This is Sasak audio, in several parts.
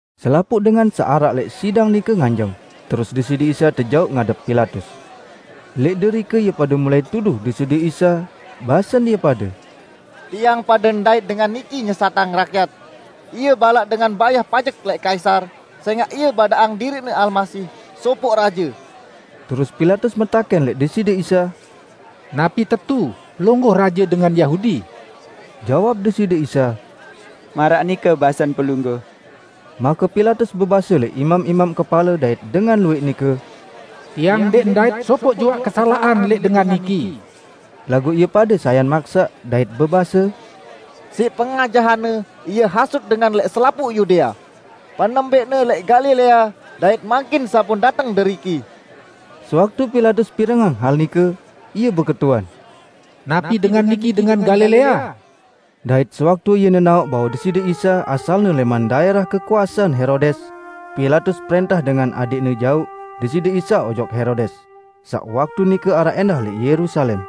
Selapuq dengan saq araq lẽq sidang nike nganjeng, terus Deside Isa tejauq ngadep Pilatus. Lẽq derike ie pade mulai tuduh Deside Isa, basen ie pade, "Tiang pade ndait Dengan niki nyesatang rakyat. Ie balaq dengan bayah pajek lẽq Kaisar, sẽngaq Ie badaqang diriqne Almasih, sopoq Raje." Terus Pilatus metakẽn lẽq Deside Isa, "Napi tetu Pelungguh raje dengan Yahudi?" Jawab Deside Isa, "Maraq nike basen Pelungguh." Make Pilatus bebase lẽq imam-imam kepale dait dengan luwẽq nike, "Tiang ndẽq ndait sopoq juaq kesalaqan lẽq Dengan niki." Laguq ie pade sayan maksaq dait bebase, "Siq pengajahan-Ne Ie hasut dengan lẽq selapuq Yudea; penembẽqne lẽq Galilea dait mangkin sampun dateng deriki." Sewaktu Pilatus pirengang hal nike, ie beketuan, "Napi Dengan niki dengan Galilea?" Dait sewaktu ie nenaoq bahwe Deside Isa asalne lẽman daẽrah kekuasean Herodes, Pilatus prẽntah dengan adẽqne jauq Deside Isa ojok Herodes, saq waktu nike araq ẽndah lẽq Yerusalem.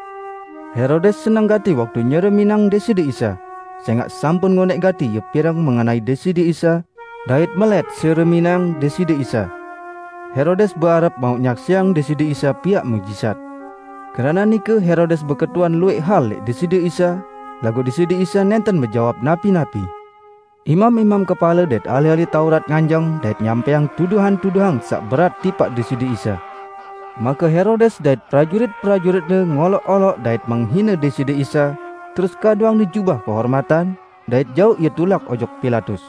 Herodes seneng gati waktu nyereminang Deside Isa, sẽngaq sampun ngonẽq gati ie pireng mengenai Deside Isa, dait melẽt sereminang Deside Isa. Herodes beharep mauq nyaksiang Deside Isa piaq muqjizat. Keranaq nike Herodes beketuan luwẽq hal lẽq Deside Isa, laguq Deside Isa nẽnten bejawab napi-napi. Imam-imam kepale dait ahli-ahli Taurat nganjeng dait nyampẽang tuduhan-tuduhan saq berat tipaq Deside Isa. Make Herodes dait prajurit-prajuritne ngoloq-oloq dait menghine Deside Isa, terus kaduangne jubah kehormatan, dait jauq Ie tulak ojok Pilatus.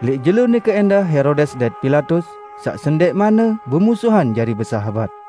Lẽq jelo nike ẽndah Herodes dait Pilatus, saq sendẽqmanne bemusuhan jari besahabat.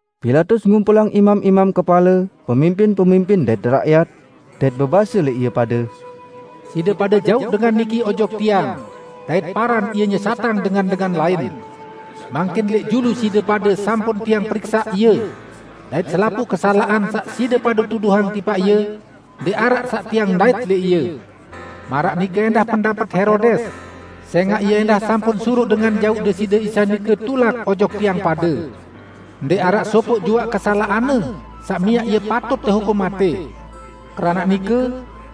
Pilatus ngumpulang imam-imam kepale, pemimpin-pemimpin dait rakyat, dait bebase lẽq ie pade, "Side pade jauq dengan niki ojok tiang dait paran Ie nyesatang dengan-dengan lain. Mangkin lẽq julu side pade sampun tiang periksaq Ie, dait selapuq kesalaqan saq side pade tuduhang tipaq Ie ndẽq araq saq tiang ndait lẽq Ie. Maraq nike ẽndah pendapet Herodes, sẽngaq ie ẽndah sampun suruq dengan jauq Deside Isa nike tulak ojok tiang pade. Ndẽq araq sopoq juaq kesalaqan-Ne saq miaq Ie patut tehukum matẽ. Keranaq nike,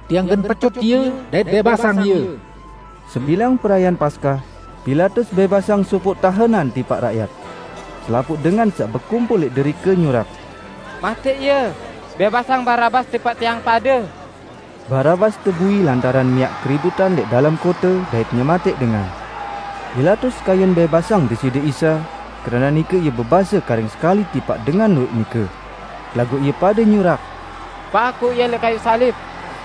tiang gen pecut Ie dait bẽbasang Ie." [ Sebilang perayaan Paskah, Pilatus bẽbasang sopoq tahenan tipaq rakyat.] Selapuq dengan saq bekumpul lẽq derike nyurak, "Matẽq Ie! Bẽbasang Barabas tipaq tiang pade!" ( Barabas tebui lantaran miaq keributan lẽq dalem kote dait nyematẽq dengan.) Pilatus kayun bẽbasang Deside Isa, keranaq nike ie bebase karing sekali tipaq dengan luwẽq nike. Laguq ie pade nyurak, "Pakuq Ie lẽq kayuq salib!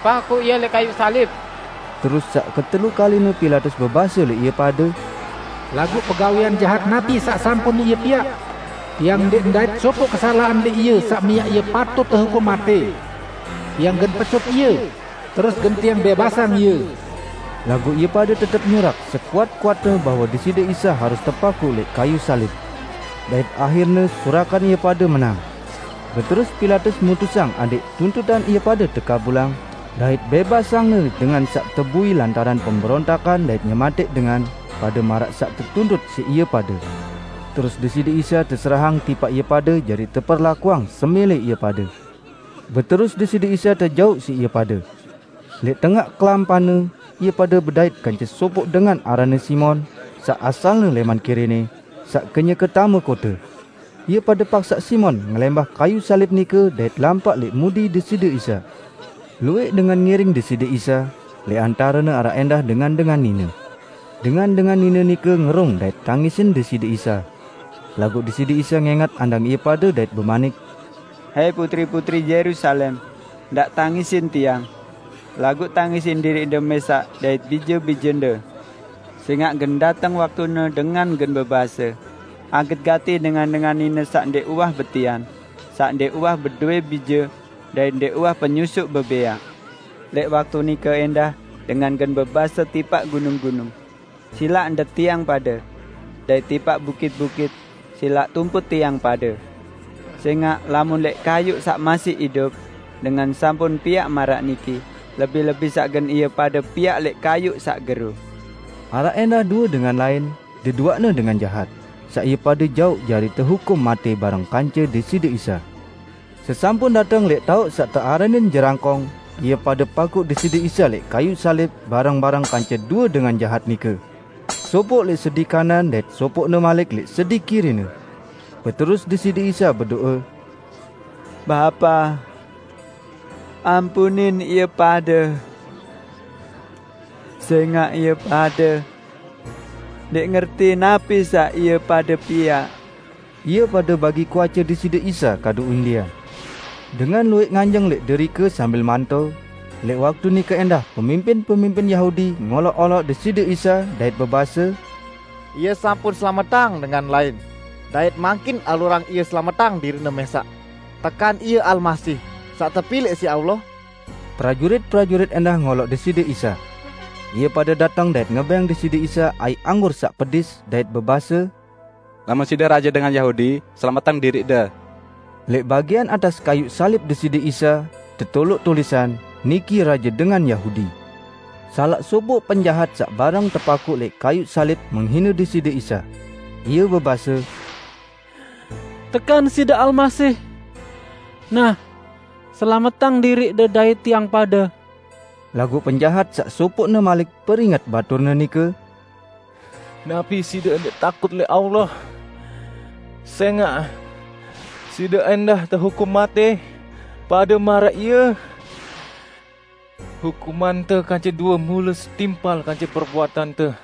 Pakuq Ie lẽq kayuq salib!" Terus saq ketelu kaline Pilatus bebase lẽq ie pade, "Laguq pegawẽan jahat napi saq sampun Ie piaq? Tiang ndẽq ndait sopoq kesalaqan lẽq Ie saq miaq Ie patut tehukum matẽ. Tiang gen pecut Ie, terus gen tiang bẽbasang Ie!" Laguq ie pade tetep nyurak sekuat-kuatne bahwe Deside Isa harus tepakuq lẽq kayuq salib. Dait ahirne surakan ie pade menang. Beterus Pilatus mutusang adẽq tuntutan ie pade tekabulang, dait bẽbasangne dengan saq tebui lantaran pemberontakan dait nyematẽq dengan pade maraq saq tetuntut siq ie pade. Terus Deside Isa teserahang tipaq ie pade jari teperlakuang semẽlẽ ie pade. Beterus Deside Isa tejauq siq ie pade. Lẽq tengaq kelampanne, ie pade bedait kance sopoq dengan aranne Simon, saq asalne lẽman Kirene, saq kenyeke tame kote. Ie pade paksaq Simon ngelẽmbah kayuq salib nike dait lampaq lẽq mudi Deside Isa. Luwẽq dengan ngiring Deside Isa; lẽq antarene araq ẽndah dengan-dengan nine. Dengan-dengan nine nike ngerung dait tangisin Deside Isa. Laguq Deside Isa ngẽngat andang ie pade dait bemanik, "Hai, putri-putri Yerusalem! Ndaq tangisin Tiang. Laguq tangisin diriqde mẽsaq dait bije-bijende. Sẽngaq gen dateng waktune dengan gen bebase, 'Aget gati dengan-dengan nine saq ndẽq uwah betian, saq ndẽq uwah bedowẽ bije dait ndẽq uwah penyusuq bebẽaq!' Lẽq waktu nike ẽndah dengan gen bebase tipaq gunung-gunung, 'Silaq ndet tiang pade!' Dait tipaq bukit-bukit, 'Silaq tumput tiang pade!' Sẽngaq lamun lẽq kayuq saq masih idup, dengan sampun piaq maraq niki, lebih-lebih saq gen ie pade piaq lẽq kayuq saq gero!" Araq ẽndah due dengan lain -- deduaqne dengan jahat -- saq ie pade jauq jari tehukum matẽ bareng kance Deside Isa. Ssesampun dateng lẽq taoq saq tearanin, "Jerangkong", ie pade pakuq Deside Isa lẽq kayuq salib bareng-bareng kance due dengan jahat nike -- sopoq lẽq sedi kanan dait sopoqne malik lẽq sedi kiri-Ne. Beterus Deside Isa bedo'e, "Bapa, ampunin ie pade! Sẽngaq ie pade ndẽq ngerti napi saq ie pade piaq." Ie pade bagi kuace Deside Isa kadu undian. Dengan luwẽq nganjeng lẽq derike sambil manto, lẽq waktu nike ẽndah pemimpin-pemimpin Yahudi ngoloq-oloq Deside Isa, dait bebase, "Ie sampun selametang dengan lain; dait mangkin alurang Ie selametang diriq-Ne mẽsaq. Tekan Ie Almasih, saq tepilẽq siq Allah?" Prajurit-prajurit ẽndah ngoloq Deside Isa. Ie pade dateng dait ngebẽng Deside Isa aiq anggur saq pedis dait bebase, "Lamun Side raje dengan Yahudi, selametang diriq-De." Lẽq bagian atas kayuq salib Deside Isa, tetoloq tulisan: "Niki Raje Dengan Yahudi." Salaq sopoq penjahat saq bareng tepakuq lẽq kayuq salib menghine Deside Isa. Ie bebase, "Tekan Side Almasih? Nah, selametang diriq-De dait tiang pade!" Laguq penjahat saq sopoqne malik peringet baturne nike, "Napi side ndẽq takut lẽq Allah sẽngaq side ẽndah tehukum matẽ pade maraq Ie. Hukumante kance due mule setimpal kance perbuatante,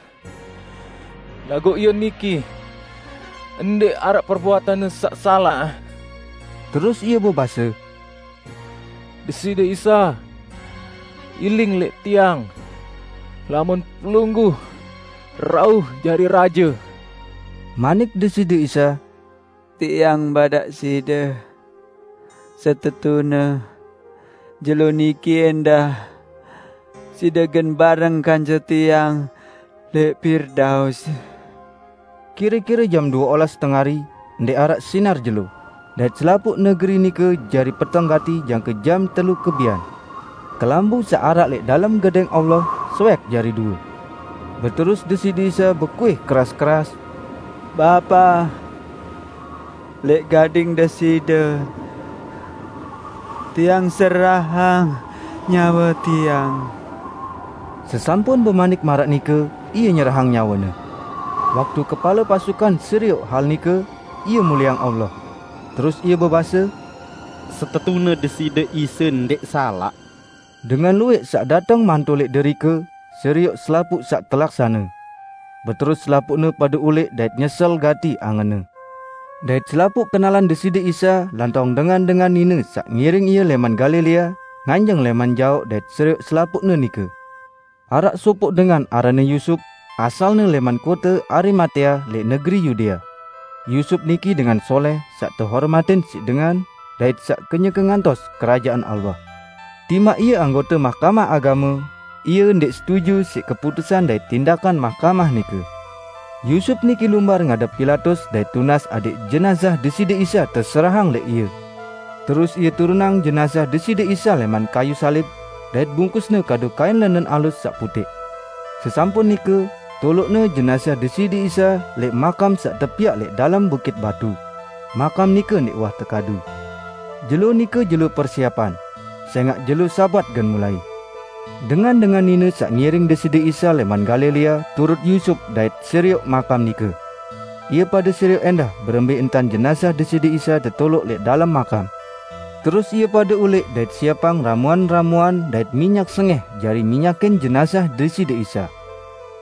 laguq Ie niki, ndẽq araq perbuatan-Ne saq salaq!" Terus ie bebase, "Deside Isa, iling lẽq tiang lamun Pelungguh rauh jari Raje!" Manik Deside Isa, "Tiang badaq side, setetune jelo niki ẽndah side gen bareng kance Tiang lẽq Pirdaus." Kire-kire jam due olas tengari, ndẽq araq sinar jelo, dait selapuq negeri nike jari peteng gati jangke jam telu kebian. Kelambu saq araq lẽq dalem Gedẽng Allah, soẽk jari due. Beterus Deside Isa bekuih keras-keras, "Bapa! Lẽq gading Deside Tiang serahang nyawe Tiang!" Sesampun bemanik maraq nike, Ie nyerahang nyawe-Ne. Waktu kepale pasukan serioq hal nike, ie mulieang Allah. Terus ie bebase, "Setetune Deside Isa ndẽq salaq!" Dengan luwẽq saq dateng manto lẽq derike, serioq selapuq saq telaksane. Beterus selapuqne pade ulẽq dait nyesel gati angenne. Dait selapuq kenalan Deside Isa lantong dengan-dengan nine saq ngiring Ie lẽman Galilea, nganjeng lẽman jaoq dait serioq selapuqne nike. Araq sopoq dengan aranne Yusup, asalne lẽman kote Arimatea lẽq negeri Yudea. Yusup niki dengan solẽh saq tehormatin siq dengan, dait saq kenyeke ngantos Kerajaan Allah. Timaq ie anggote Mahkamah Agame, ie ndẽq setuju siq keputusan dait tindakan mahkamah nike. Yusup niki lumbar ngadep Pilatus dait tunas adẽq jenazah Deside Isa teserahang lẽq ie. Terus ie turunang jenazah Deside Isa lẽman kayuq salib, dait bungkusne kadu kain lẽnen alus saq putẽq. Sesampun nike, toloqne jenazah Deside Isa lẽq makam saq tepiaq lẽq dalem bukit batu -- makam nike ndẽq uwah tekadu. Jelo nike jelo persiepan; sẽngaq jelo Sabat gen mulai. Dengan-dengan nine saq ngiring Deside Isa lẽman Galilea turut Yusup dait serioq makam nike. Ie pade serioq ẽndah berembẽ entan jenazah Deside Isa tetoloq lẽq dalem makam. Terus ie pade ulẽq dait siepang ramuan-ramuan dait minyak sengẽh jari minyakin jenazah Deside Isa.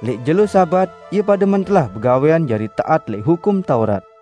Lẽq jelo Sabat, ie pade mentelah begawẽan jari taat lẽq Hukum Taurat.